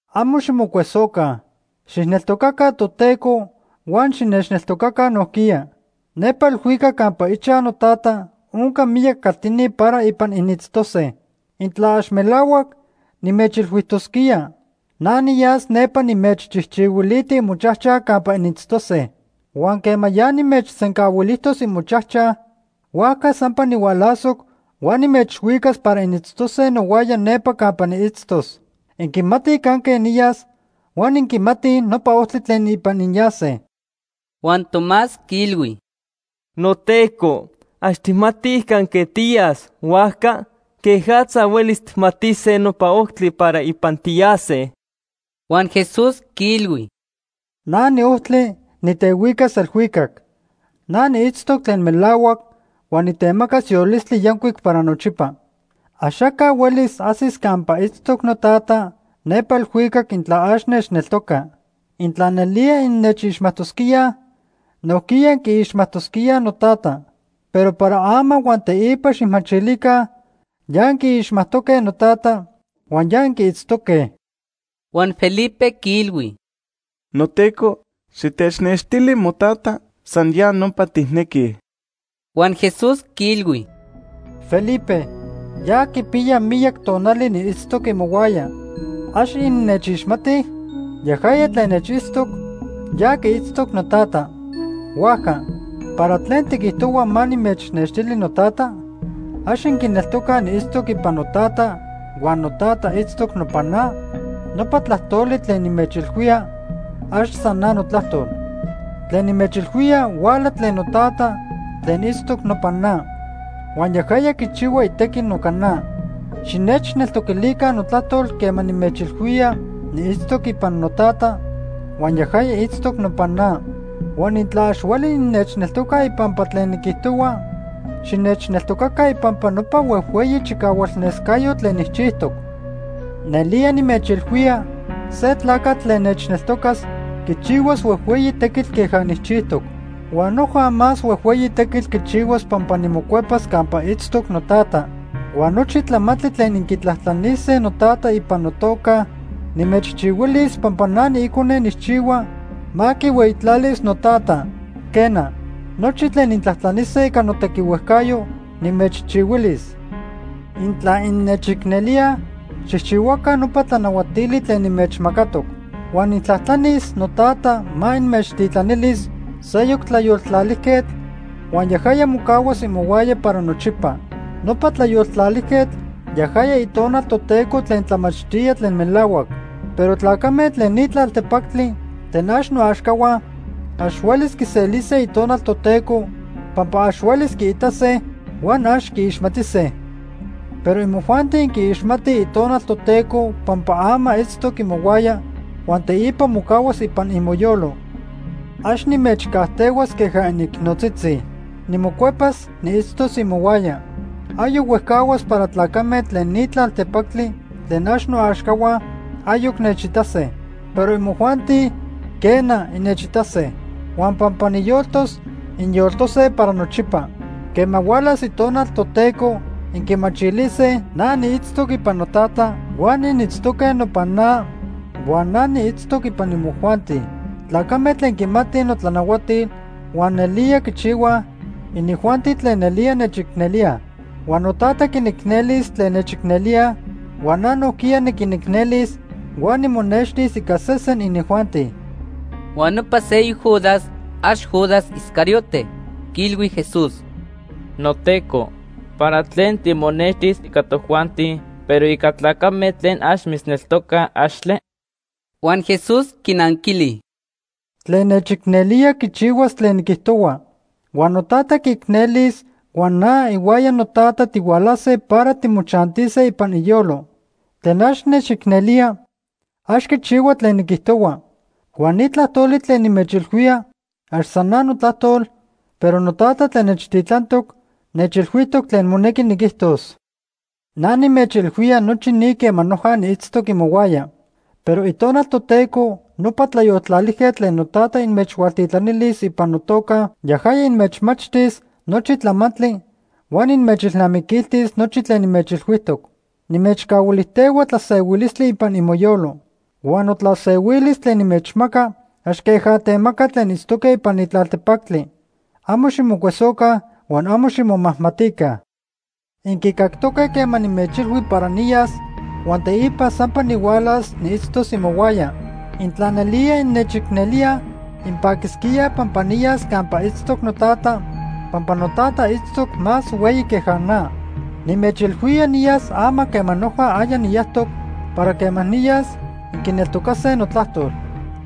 “Amo ximocuesoca. Xijneltocaca Toteco huan xinechneltocaca nojquiya. Nepa elhuicac campa ichaj noTata onca miyac caltini para ipan initztose. Intla ax melahuac, nimechilhuijtosquía. Na niyas nepa nimechchijchihuiliti imochajchaj campa initztose. Huan quema ya nimechsencahuilijtos imochajchaj, huajca sampa nihualasoc huan nimechhuicas para initztose nohuaya nepa campa niitztos. Inquimatij canque niyas huan inquimatij nopa ojtli tlen ipan inyase.” Huan Tomás quiilhui: ―NoTeco, ax tijmatij canque tiyas, huajca ¿quejatza huelis tijmatise nopa ojtli para ipan tiyase? Huan Jesús quiilhui: ―Na niojtli, nitehuicas elhuicac. Na niitztoc tlen melahuac huan nitemacas yolistli yancuic para nochipa. Axaca huelis ajsis campa itztoc noTata nepa elhuicac intla ax nechneltoca. Intla nelía innechixmajtosquíaj, nojquiya inquiixmajtosquíaj noTata. Pero para ama huan teipa xijmachilica ya inquiixmajtoque noTata huan ya inquiitztoque. Huan Felipe quiilhui: ―NoTeco, xitechnextili moTata, san ya nopa tijnequij. Huan Jesús quiilhui: ―Felipe, ya quipiya miyac tonali niitztoc imohuaya. ¿Ax innechixmatij? Yajaya tlen nechitztoc, ya quiitztoc noTata. Huajca, ¿para tlen tiquijtohua ma nimechnextili noTata? ¿Ax inquineltocaj niitztoc ipan noTata huan noTata itztoc nopan na? Nopa tlajtoli tlen nimechilhuía, ax san na notlajtol. Tlen nimechilhuía huala tlen noTata tlen itztoc nopan na. Huan yajaya quichihua itequi noca na. Xinechneltoquilica notlajtol quema nimechilhuía niitztoc ipan noTata huan yajaya itztoc nopan na. Huan intla ax hueli innechneltocaj ipampa tlen niquijtohua, xinechneltocaca ipampa nopa huejhueyi chicahualnescayotl tlen nijchijtoc. Nelía nimechilhuía, se tlacatl tlen nechneltocas quichihuas huejhueyi tequitl queja nijchijtoc. Huan noja más huejhueyi tequitl quichihuas pampa nimocuepas campa itztoc noTata. Huan nochi tlamantli tlen inquitlajtlanise noTata ipan notoca, nimechchihuilis pampa na niIcone nijchihua ma quihueyitlalis noTata. Quena, nochi tlen intlajtlanise ica notequihuejcayo, nimechchihuilis. “Intla innechicnelíaj, xijchihuaca nopa tlanahuatili tlen nimechmacatoc. Huan nijtlajtlanis noTata ma inmechtitlanilis seyoc Tlayoltlalijquetl huan yajaya mocahuas imohuaya para nochipa. Nopa Tlayoltlalijquetl yajaya Itonal Toteco tlen tlamachtía tlen melahuac. Pero tlacame tlen ni tlaltepactli tlen ax noaxcahua ax huelis quiselise Itonal Toteco pampa ax huelis quiitase huan ax quiixmatise. Pero imojuanti inquiixmatij Itonal Toteco pampa ama itztoc imohuaya huan teipa mocahuas ipan imoyolo. “Ax nimechcajtehuas queja inicnotzitzi. Nimocuepas niitztos imohuaya. Ayoc huejcahuas para tlacame tlen ni tlaltepactli tlen ax noaxcahua ayoc nechitase. Pero imojuanti, quena, innechitase. Huan pampa niyoltos, inyoltose para nochipa. Quema hualas Itonal Toteco, inquimachilise na niitztoc ipan noTata, huan initztoque nopan na huan na niitztoc ipan imojuanti. Tlacame tlen quimatij notlanahuatil huan nelía quichihuaj, inijuanti tlen nelía nechicnelíaj. Huan noTata quinicnelis tlen nechicnelíaj, huan na nojquiya niquinicnelis huan nimonextis ica sesen inijuanti.” Huan nopa seyoc Judas (ax Judas Iscariote) quiilhui Jesús: ―NoTeco, ¿para tlen timonextis ica tojuanti, pero ica tlacame tlen ax mitzneltocaj, axtle? Huan Jesús quinanquili: ―Tlen nechicnelía quichihuas tlen niquijtohua. Huan noTata quiicnelis huan na ihuaya noTata tihualase para timochantise ipan iyolo. Tlen ax nechicnelía ax quichihua tlen niquijtohua. Huan ni tlajtoli tlen nimechilhuía ax san na notlajtol, pero noTata tlen nechtitlantoc nechilhuijtoc tlen monequi niquijtos. “Na nimechilhuía nochi ni quema noja niitztoc imohuaya. Pero Itonal Toteco, nopa Tlayoltlalijquetl, tlen noTata inmechhualtitlanilis ipan notoca yajaya inmechmachtis nochi tlamantli huan inmechilnamiquiltis nochi tlen nimechilhuijtoc. “Nimechcahuilijtehua tlasehuilistli ipan imoyolo. Huan notlasehuilis tlen nimechmaca ax queja temacaj tlen itztoque ipan ni tlaltepactli. Amo ximocuesoca huan amo ximomajmatica. Inquicactoque quema nimechilhui para niyas huan teipa sampa nihualas niitztos imohuaya. Intla nelía innechicnelíaj, inpaquisquíaj pampa niyas campa itztoc noTata pampa noTata itztoc más hueyi queja na. Nimechilhuía niyas ama quema noja aya niyajtoc para quema niyas, inquineltocase notlajtol.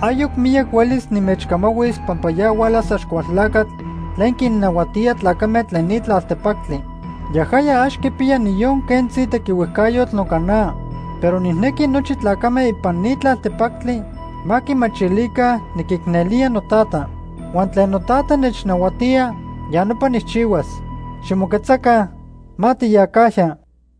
“Ayoc miyac huelis nimechcamahuis pampa ya hualas Axcualtlacatl tlen quinnahuatía tlacame tlen ni tlaltepactli. Yajaya ax quipiya niyon quentzi tequihuejcayotl noca na. Pero nijnequi nochi tlacame ipan ni tlaltepactli ma quimachilica niquicnelía noTata. Huan tlen noTata nechnahuatía, ya nopa nijchihuas. Ximoquetzaca, ma tiyacajya.